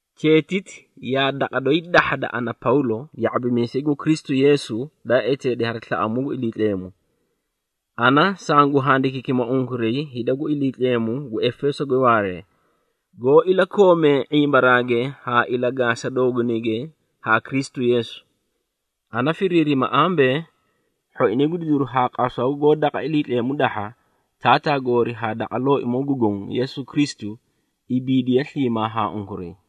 Cheetiti yaa daqa doyi dahhada ana Pawlo, ya⁄abimiisay gu Kristu Yeesu daa eteedi hari slaꞌamuu gu Iliitleemu. Ana sangu handikiikima unkuray hida gu Iliitleemu gu Efeesoge waaree, goó ilakoomee ⁄imbaraage haa ilagaasa doogunayge haa Kristu Yeesu. Ana firiirima ambee, hhoinay gu didiru haa qasaw goó daqa Iliitleemu dahha, Taataa goori haa daqa Looimoo gu Goõ Yeesu Kristu, ibiidiye sliimaa haa unkuray.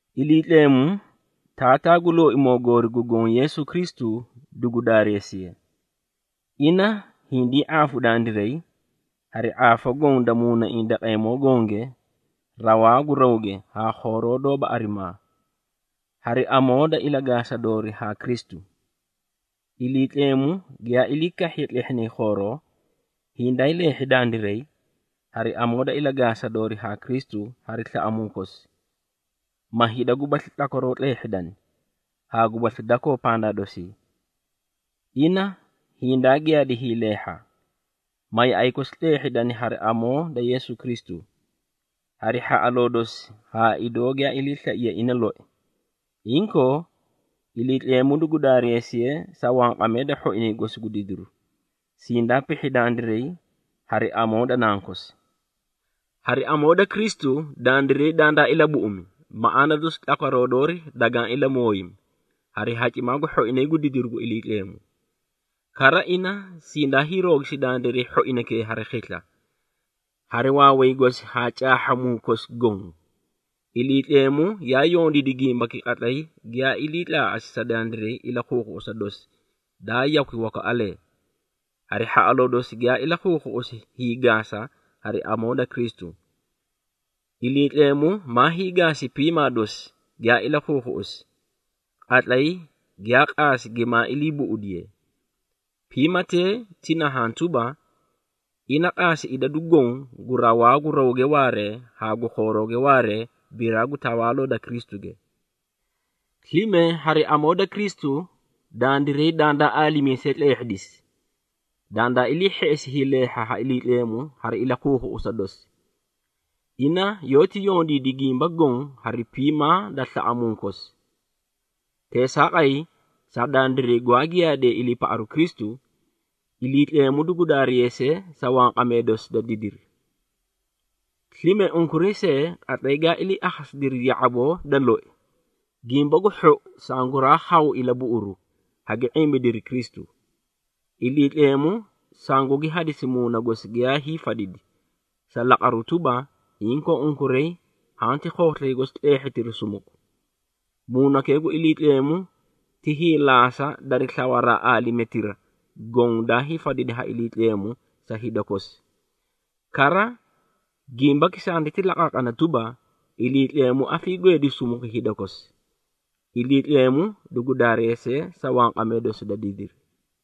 Iliitleemu, Taataa gu Looimoo goori gu Goõ Yeesu Kristu dugu daareesiye. Ina hindii ⁄aafu dandiray, hari ⁄aafa goõ da muunaiĩ daqeemoo gonge rawaa gu rawge haa khooroo doóba arimaa, hari amoo da ilagaasa doori haa Kristu. Iliitleemu giyaa ilii kahhiye tlehhinay khooroo, hindaay leehhi dandiray, hari amoo da ilagaasa doori haa Kristu hari slaꞌamuu kosi, ma hida gubasli tlakwaroo tleehhidani, haa gubasli dakoo pandaa dosii. Ina hindaa giyaadi hiileehha, ma yaꞌay kosi tleehhidani hari amoo da Yeesu Kristu, hari hhaꞌaloo dosi haa idoo giyaa iliislaiye ina loi. Inkoo, Iliitleemu dugu daareesiye sa wanqamee da hhoinay gosi gu didiru, sindaa pihhi dandiray hari amoo da Nankosi. Hari amoo da Kristu, dandiray dandaa ilabuꞌumi, maꞌaana dosi tlakwaroo doori dagaã ilamooyimi, hari hacimaa gu hhoinay gu didiru gu Iliitleemu. Kara, ina sindaa hiiroogisi dandiray hhoinaykee hari khisla, hari waaway gosi haa caahhamuu kosi goõ. Iliitleemu yaa yondiidi gimbaki qatlay giyaa ilii tlaaꞌasi sa dandiray ilakhuukhuꞌusa dosi daa yakwi wakaꞌalee, hari hhaꞌaloo dosi giyaa ilakhuukhuꞌusi hiigaasa hari amoo da Kristu. Iliitleemu maa hiigaasi piimaa dosi giyaa ilakhuukhuꞌusi, qatlay giyaa qaasi gimaa ilii buꞌudiye. Piimatee ti nahaã tuba, ina qaasi idadu goõ gu rawaa gu rawge waaree haa gu khoorooge waaree biraa gu tawaaloo da Kristuge. Slime hari amoo da Kristu dandiray dandaa aalimiisee tleehhidisi, dandaa ilii hheꞌesi hiileehha ha Iliitleemu hari ilakhuukhuꞌusa dosi. Ina yoóti yondiidi gimba goõ hari piimaa da slaꞌamuu kosi. Teesaaqay, sa dandiray gwaa giyaadee iliipaꞌaru Kristu, Iliitleemu dugu daareesiye sa wanqamee dosi da didiri! Slime unkuray see, qatlay gaa ilii akhasidiri ya⁄aboo da loi, Gimba gu Hhou sanguraa khawu ilabuꞌuru, hagi ⁄imbidiri Kristu. Iliitleemu sangugi hadisi Muuna gosi giyaay fadidi, sa laqaru tuba, inkoo unkuray hanti khooslay gosi tleehhitiri sumuku. Muunakee gu Iliitleemu ti hiilaasa dari slawaraa aalimetira goõ daay fadidi ha Iliitleemu sa hida kosi. Kara, gimbaki sanditi laqaaqana tuba, Iliitleemu afiigweedi sumuku hida kosi. Iliitleemu dugu daareesiye sa wanqamee dosi da didiri!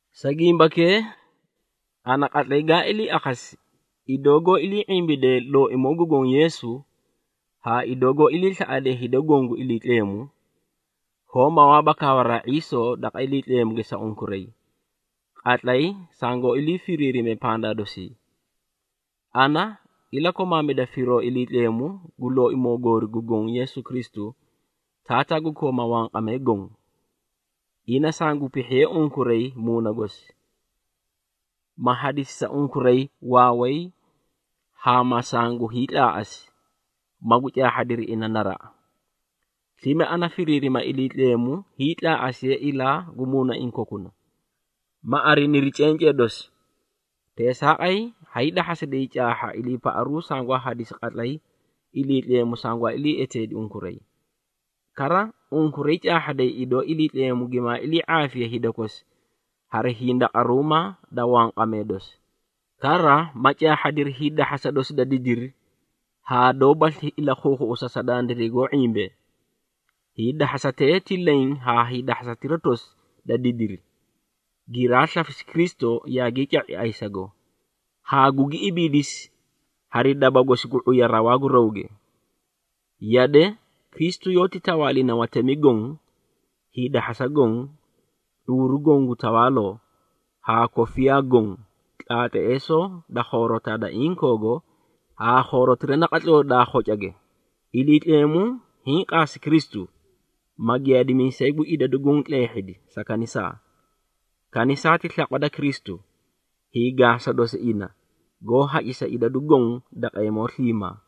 Sa gimbakee, ana qatlay gaa ilii akhasi, idoo goó ilii ⁄imbidee Looimoo gu Goõ Yeesu, haa idoo goó iliislaꞌadee hida goõ gu Iliitleemu, hoó mawaaba kawaraa ⁄iisoo daqa Iliitleemuge sa unkuray, qatlay sangoó ilii firiirime pandaa dosii. Ana ilakomaamida firoo Iliitleemu gu Looimoo goori gu Goõ Yeesu Kristu, Taataa gu kooma wanqamee goõ. Ina sangu pihhiye unkuray Muuna gosi, ma hadisi sa unkuray waaway haa ma sangu hiitlaaꞌasi, magu caahhadiri ina naraꞌa. Slime ana ha firiirima Iliitleemu hiitlaaꞌasiye ilaa gu muunaiĩ kokuna, ma ariniri cencee dosi. Teesaaqay hay dahhasiday caahha iliipaꞌaru sangwaa hadisi qatlay Iliitleemu sangwaa ilii eteedi unkuray. Kara, unkuray caahhaday idoo Iliitleemu gimaa ilii⁄aafiye hida kosi hari hindaqaruumaa da wanqamee dosi. Kara ma caahhadiri hiidahhasa dosi da didiri haa doóbasli ilakhuukhuꞌusa, sa dandiray goó ⁄imbee. Hiidahhasatee ti leẽ haa hiidahhasatira tosi da didiri, giraa slafisi Kristu yaagii ca⁄i ayisago, haa gugi ibiidisi hari daba gosi gu ⁄uya rawaa gu rawge. Yade, Kristu yoóti tawaalina watemi goõ, hiidahhasa goõ, ⁄uuru goõ gu tawaaloo, haa kofiyaa goõ, tlaatleesoo da khoorotaa da inkoogo, haa khoorotira naqatloo daa khocage. Iliitleemu hiĩ qaasi Kristu, ma giyaadimiisay gu idadu goõ tleehhidi, sa kanisaa. Kanisaa ti slaqwa da Kristu, hiigaasa dosi ina goó hacisa idadu goõ daqeemoo sliimaa.